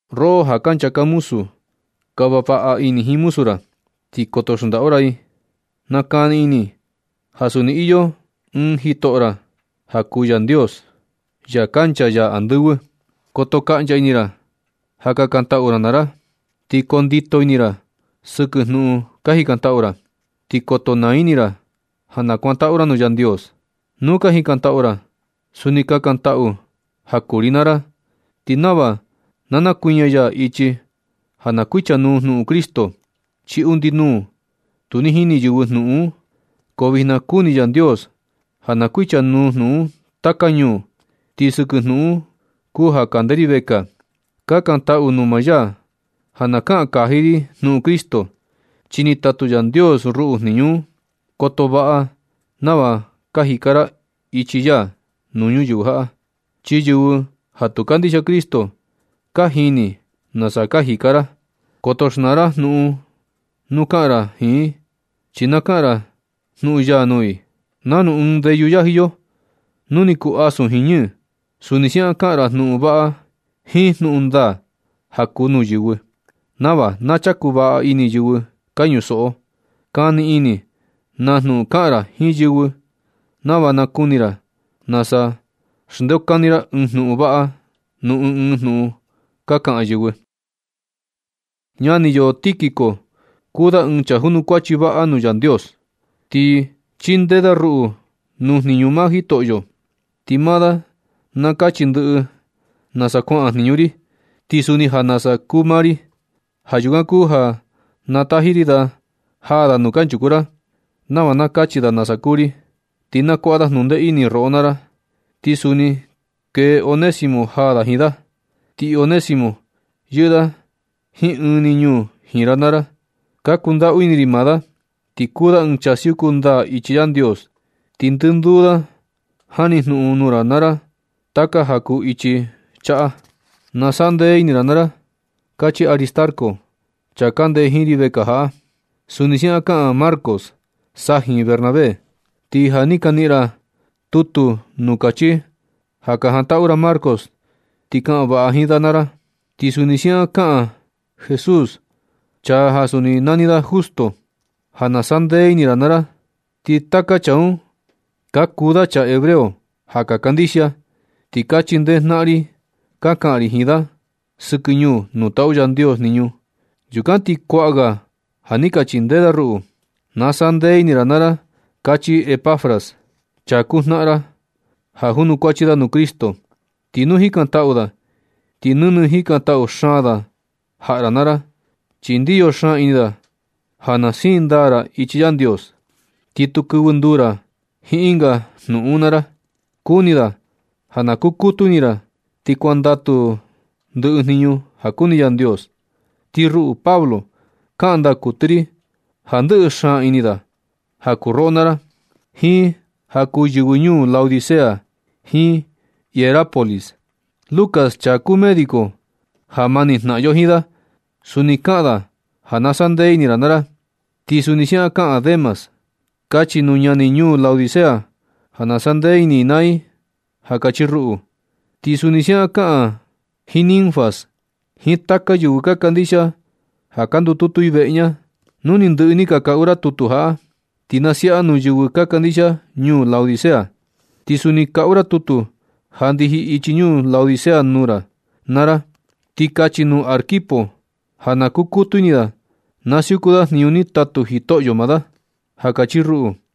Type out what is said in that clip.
Roꞌo ja ka nchaka muzu, kava vaꞌa ini jiin muzu ra, ti koto xndaꞌu ra i. Nakani ini ja suni iyo ɨɨn Jitoꞌo ra ja kuu Yandios, ya kancha ya andɨvɨ. Koto kaꞌncha ini ra ja kakantaꞌu ra naa ra. Ti koo ndito ini ra sɨkɨ jnuꞌun ka jikantaꞌu ra. Ti koto naa ini ra ja na nakuantaꞌu ra nuu Yandios. Nu ka jikantaꞌu ra, suni kakantaꞌu ja kuu ri naa ra, ti nava na nakuiña ya ichi ja na kuichanuu jnuꞌun Cristo. Chi undi nuu tu ni jini yɨvɨ jnuꞌun un, ko vijna kuni Yandios ja na kuichanuu jnuꞌun un taka ñuu. Ti sɨkɨ jnuꞌun un kuu ja kande ri vekaa. Kakantaꞌu nuu maa ya ja na kaꞌan kaji ri jnuꞌun Cristo, chi ni tatu Yandios ruꞌu jniñu un. Koto vaꞌa nava ka jika ra ichi ya nuu ñuyɨvɨ jaꞌa, chi yɨvɨ ja tu kandixia Cristo ka jini nasa ka jika ra. Koto xnaa ra jnuꞌun nu kaꞌan ra jiin i, chi na kaꞌan ra jnuꞌun ya nuu i. Nanu ɨɨn ndeyu yaji yo nu ni kuu asun jiin ñɨɨ, suni siaꞌan kaꞌan ra jnuꞌun vaꞌa jiin jnuꞌun ndaa ja kuu nuu yɨvɨ, nava na chaku vaꞌa ini yɨvɨ ka ñusoꞌo. Kani ini na jnuꞌun kaꞌan ra jiin yɨvɨ, nava nakuni ra nasa xndeokani ra ɨɨn jnuꞌun vaꞌa nuu ɨɨn ɨɨn jnuꞌun ka kaꞌan yɨvɨ. Ñani yo Tíquico kuu da ɨɨn chaa junukuachi vaꞌa nuu Yandios. Ti chindee da ruꞌu nuu jniñu maa Jitoꞌo. Ti maa da na kachi ndɨꞌɨ nasa kuaꞌan jniñu ri, ti suni ja nasa kuu maa ri. Ja yukan kuu ja na taji ri da jaa da nuu kanchuku ra, nava na kachi da nasa kuu ri. Ti na kuaꞌa da jnundee ini roꞌo naa ra. Ti suni kee Onésimo jaa da jiin da. Ti Onésimo yɨꞌɨ da jiin ɨɨn ni ñuu jiin ra naa ra. Ka kundaꞌu ini ri maa da, ti kuu da ɨɨn chaa siuku ndaa ichi Yandios. Ti ndɨnduu da jani jnuꞌun nuu ra naa ra taka ja kuu ichi chaꞌa. Na saꞌa ndee ini ra naa ra, kachi Aristarco, chaa kande jiin ri vekaa jaꞌa. Suni siaꞌan kaꞌan Marcos, sajin Bernabé. Ti ja ni ka niꞌin ra tutu nuu kachi ja ka jantaꞌu ra Marcos, ti kaꞌan vaꞌa jiin da naa ra. Ti suni siaꞌan kaꞌan Jesús, chaa ja suni nani da Justo, ja na saꞌa ndee ini ra naa ra. Ti taka chaa un ka kuu da chaa hebreo ja ka kandixia, ti ka chindee jnaꞌan ri ka kaꞌan ri jiin da sɨkɨ ñuu nuu taꞌu Yandios jniñu. Yukan ti kuaꞌa ga ja ni ka chindee da ruꞌu. Na saꞌa ndee ini ra naa ra, kachi Epafras, chaa kuu jnaꞌan ra, ja junukuachi da nuu Cristo. Ti nu jikantaꞌu da ti nɨnɨ jikantaꞌu xaan da jaꞌa ra naa ra, chi ndiyo xaan ini da ja na siin ndaa ra ichi Yandios, ti tu kɨvɨ nduu ra jiin ɨnga jnuꞌun naa ra. Kuni da ja na kukutu ini ra ti kuandatu ra ndɨꞌɨ jniñu ja kuni Yandios. Ti ruꞌu Pablo, kaꞌan ndaa kuɨtɨ ri ja ndɨꞌɨ xaan ini da ja kuu roꞌo naa ra, jiin ja kuu yɨvɨ ñuu Laodicea jiin Hierápolis. Lucas, chaa kuu médico ja mani jnaꞌan yo jiin da, suni kaꞌan da ja na saꞌa ndee ini ra naa ra. Ti suni siaꞌan kaꞌan Demas. Kachi nuu ñani ñuu Laodicea ja na saꞌa ndee ini i naa i, ja kachi ruꞌu. Ti suni siaꞌan kaꞌan ra jiin Ninfas, jiin taka yɨvɨ ka kandixia ja ka ndututu i veꞌe ña. Nu ni ndɨꞌɨ ni ka kaꞌu ra tutu jaꞌa, ti na siaꞌa nuu yɨvɨ ka kandixia ñuu Laodicea. Ti suni kaꞌu ra tutu ja ndiji ichi ñuu Laodicea nuu ra naa ra. Ti kachi nuu Arquipo ja na kukutu ini da na siuku da jniñu ni tatu Jitoꞌo maa da, ja kachi ruꞌu.